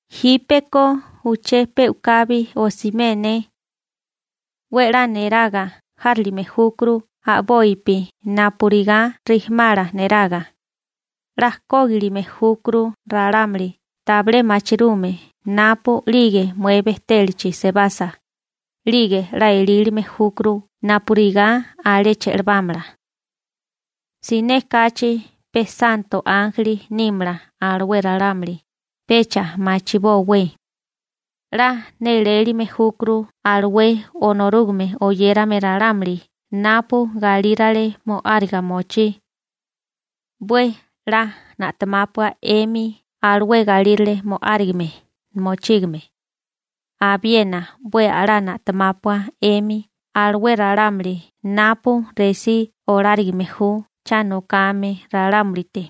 Jípeko uché pe u'kabi osimé ne. 'We 'la niraga járilime júkuru a'bopi napurigá rijimala neraga. 'La kógilime júkuru ralámuli tabilé machirume napu'lige mué bejtélachi sebasa, ('lige 'la elílime júkuru napurigá alé che'lebámala). Siné kachi pe santo ánjeli nímala alué ralámuli, pecha machibówé. 'La nélélime júkuru alué Onorúgame oyérame ralámuli napu galírale mo'áriga mochí. 'We 'la na'temápua 'emi alué galírale mo'árigame mochígame. Abiena 'we a'lá na'temápua 'emi alué ralámuli napu resí olárigime ju cha nokame ralámulite.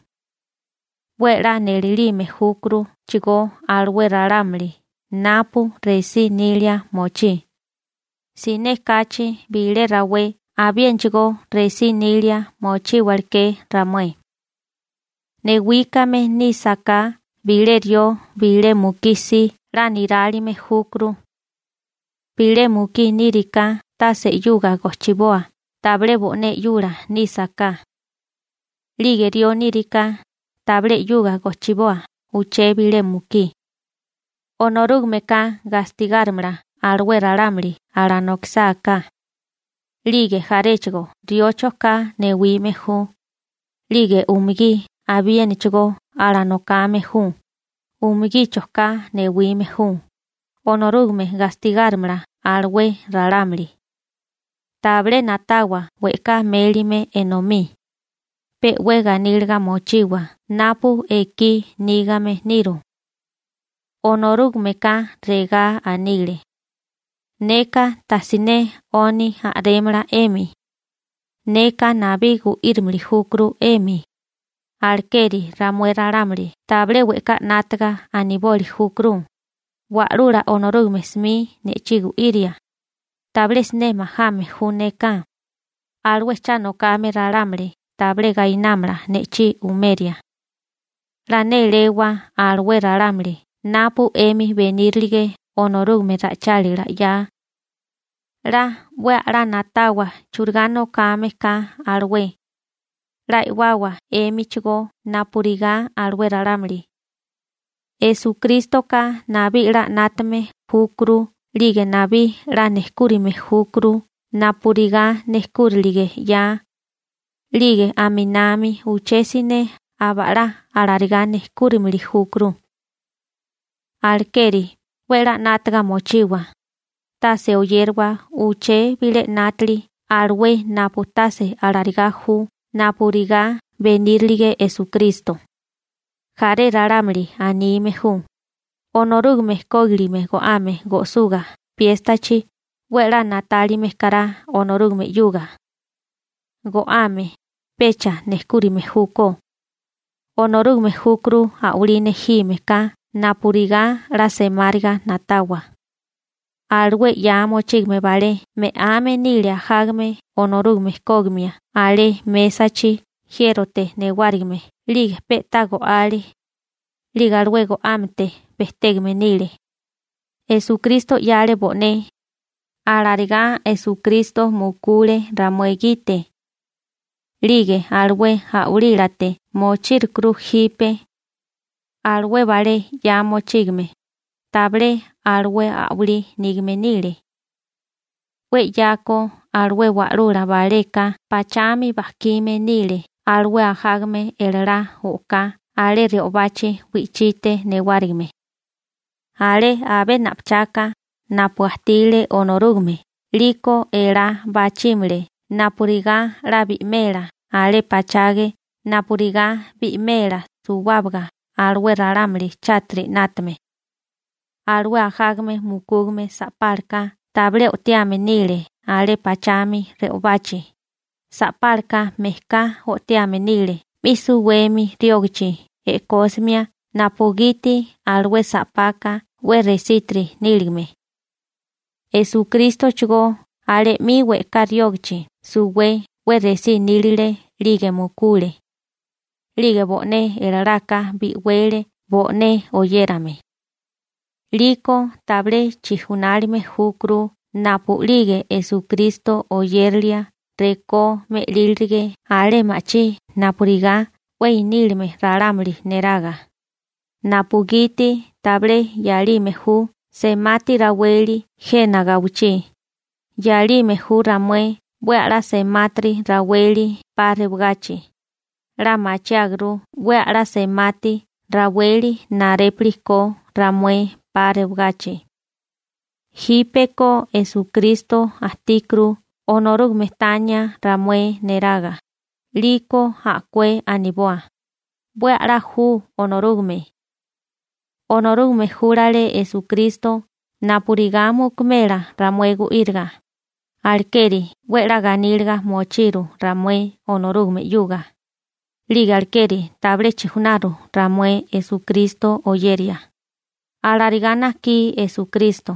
'We a'lá nélélime júkuruchigó alué ralámuli napu resí nilia mochí, siné kachi bilé rawé abiénachigó resí nilia mochíwaleké ramué. Newíkame nísaká bilé rió bilé mukí si 'la nirálime júkuru. Bilé mukí níriká tase 'yuga gojchiboa tabilé bo'né 'yula nísaká. 'Lige rió nírigaká, tabilé 'yuga gojchiboa uché bilé mukí. Onorúgameka gastigárimala alué ralámuli alanokisáká. 'Lige jaréchigo rióchoká newime ju, 'lige umugí abiénachigó alanokame ju, umugíchoká newime ju, Onorúgame gastigárimala alué ralámuli. Tabilé na'tawa we'ká mélime enomí. Pe 'we ganíliga mochiwa napu ekí nígame niru. Onorúgameka regá anile: «Neka tajsiné 'oni a'rémala 'emi. Neka nabí gu'írimili júkuru 'emi.» Alekeri ramué ralámuli tabilé we'ká 'nátaga aniboli júkuru: Wa'lula Onorúgame 'smi ne'chí gu'iria. Tabilé siné majame ju neka. Alué cha nokame ralámuli tabilé gainámala ne'chí umeria. 'La néléwa alué ralámuli napu 'emi benírilige Onorúgame ra'ichálila 'ya. 'La 'we a'lá na'tawa churigá nokame ka alué. 'La e'wawa 'émichigó napurigá alué ralámuli. Esukrístoka nabí 'la 'nátame júkuru 'lige nabí 'la nejkúrime júkuru napurigá nejkúrilige 'ya. 'Lige aminami uché siné aba'lá alarigá nejkúrimili júkuru. Alekeri 'we 'la 'nátaga mochiwa, tase oyériwa uché bilé 'nátili alué napu tase alarigá ju napurigá benírilige Esukristo. Jaré ralámuli anime ju: «Onorúgame kógilime go'ame go'suga piéstachi 'we 'la na'tálime kará Onorúgame 'yuga.» Go'ame pecha nejkúrime júkó, Onorúgame júkuru a'walí nejime ka napurigá 'la semáriga na'tawa. Alué 'ya mochígame balé me'ame nile ajágame Onorúgame kógimia alé mésachi jiérote newárigime (altar) 'lige pe'tá go'ale, 'lige alué go'ámete bejtégame nile. Esukristo 'yale bo'né, alarigá Esukristo (Onorúgame) mukule ramué gite. 'Lige alué a'walílate mochírukuru jipe. Alué balé 'ya mochígame, tabilé alué a'walí nígame nile. 'We 'yako alué wa'lula baleka pachami bajkime nile alué ajágame elalá o'ká alé re'obachi wi'chite newárigime. Alé abé 'na pachaka napu ajtile Onorúgame 'liko elá bachímale napurigá 'la bi'mela alé pachage napurigá bi'mela suwábaga alué ralámuli chátiri 'nátame. Alué ajágame mukúgame sa'pálaka tabilé o'tiame nile alé pachami re'obachi, sa'pálaka mejká o'tiame nile 'mi suwemi riógachi e'kósimia napugiti alué sa'paka 'we resítiri níligame. Esukrístochigó alé 'mi we'ká riógachi suwé 'we resí nílile 'lige mukule. 'Lige bo'né elalaka bi'wele bo'né oyérame. 'Liko tabilé chijunálime júkuru napu'lige Esukristo oyérilia rekó me'lílirige alé ma'chí napurigá 'we inílame ralámuli neraga, napugiti tabilé 'yalime ju semati raweli jena gawichí, 'yalime ju ramué 'we a'lá semátiri raweli 'pa rewagachi. 'La machiáguru 'we a'lá semátiri raweli narépili ko ramué 'pa rewagachi. Jípeko Esukristo ajtíkuru Onorúgame tania ramué neraga, 'liko a'kué aniboa: «'We a'lá ju Onorúgame.» Onorúgame júlale Esukristo napurigá mukumela ramué gu'íriga, alekeri 'we 'la ganíliga mochiru ramué Onorúgame 'yuga, 'lige alekeri tabilé chijunaru ramué Esukristo oyeria. Alarigá najkí Esukristo,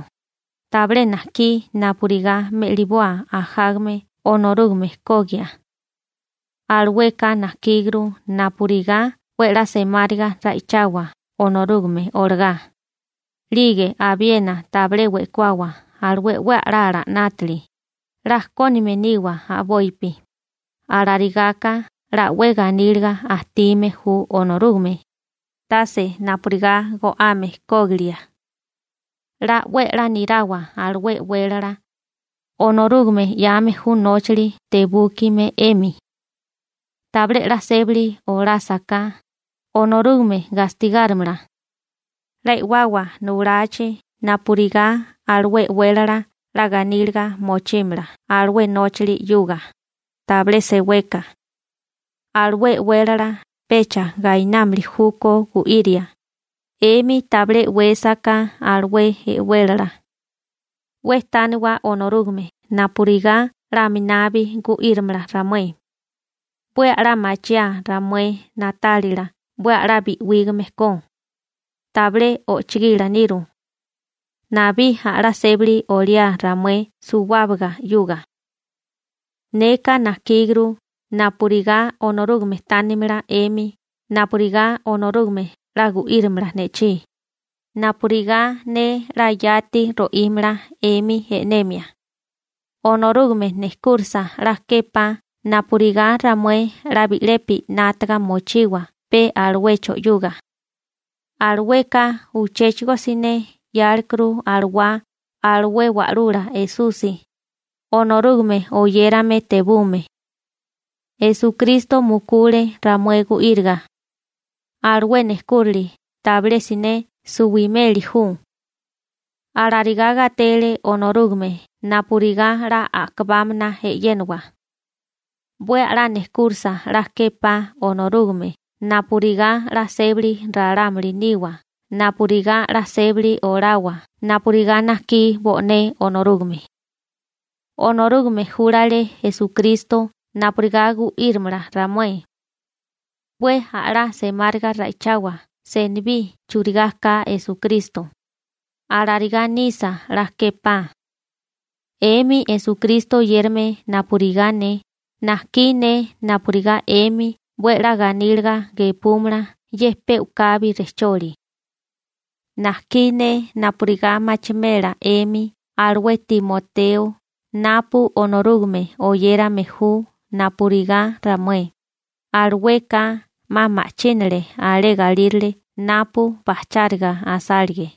tabilé najkí napurigá me'liboa ajágame Onorúgame kogia. Alueka najkíguru napurigá 'we 'la semáriga ra'ichawa Onorúgame olagá. 'Lige abiena tabilé we'kuawa alué 'we a'lala 'nátili, 'la kónime niwa a'bopi, alarigaka 'la 'we ganíliga ajtime ju Onorúgame, tase napurigá go'ame kógilia. 'La 'we a'lá nirawa alué e'wélala. Onorúgame 'yame ju nóchali tebúkime 'emi. Tabilé 'la sébali olásaká, Onorúgame gastigárimala. 'La e'wawa nulachi napurigá alué e'wélala 'la ganíliga mochímala alué nóchali 'yuga, tabilé seweka. Alué e'wélala pecha gainámili júkó gu'iria, 'emi tabilé e'wésaká alué e'wélala. 'We tániwa Onorúgame napurigá 'la aminabi gu'írimala ramué. 'We a'lá machiáa ramué na'tálila 'we a'lá bi'wígame ko. Tabilé ojchogila niru. Nabí a'lá sébali oliá ramué suwábaga 'yuga. Neka najkíguru napurigá Onorúgame tánimala 'emi napurigá Onorúgame 'la gu'írimala ne'chí, napurigá ne 'la yati ro'ímala 'emi e'nemia. Onorúgame nejkúrisa 'la képá napurigá ramué 'la bi'lepi 'nátaga mochiwa pe aluecho 'yuga. Alueka uchéchigo siné 'yálerukuru alawá alué Wa'lula Esusi, Onorúgame oyérame tebume. Esukristo mukule ramué gu'íriga. Alué nejkúrili tabilé siné suwimeli ju. Alarigá gatele Onorúgame napurigá 'la a'kabámana e'yénawa. 'We a'lá nejkúrisa 'la képá Onorúgame napurigá 'la sébali ralámuli niwa napurigá 'la sébali olawa napurigá najkí bo'né Onorúgame. Onorúgame júlale Esukristo napurigá gu'írimala ramué. 'We a'lá semáriga ra'ichawa senibí churigá ka Esukristo. Alarigá nisa 'la képá. 'Emi Esukristo oyérame napurigá ne, najkí ne napurigá 'emi 'we 'la ganíliga gepúmala ye pe u'kabi rejcholi. Najkí ne napurigá machimela 'emi alué Timoteo napu Onorúgame oyérame ju napurigá ramué, alueka 'ma ma'chínale alé galírale napu bajcháriga asálige.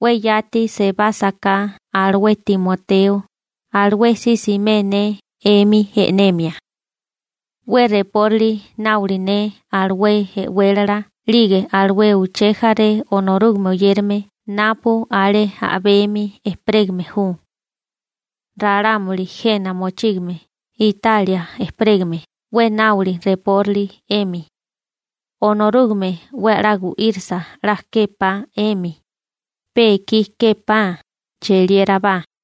'We yati sebásaká alué Timoteo, alué si simé ne 'emi e'nemia. 'We reporali náoli ne alué e'wélala 'lige alué uché jaré Onorúgame oyérame napu alé a'bemi ejperégame ju. Ralámuli jena mochígame Italia ejperégame 'we náoli reporali 'emi. Onorúgame 'we a'lá gu'írisa 'la képá 'emi. Pe ekí képá. Cheliérabá.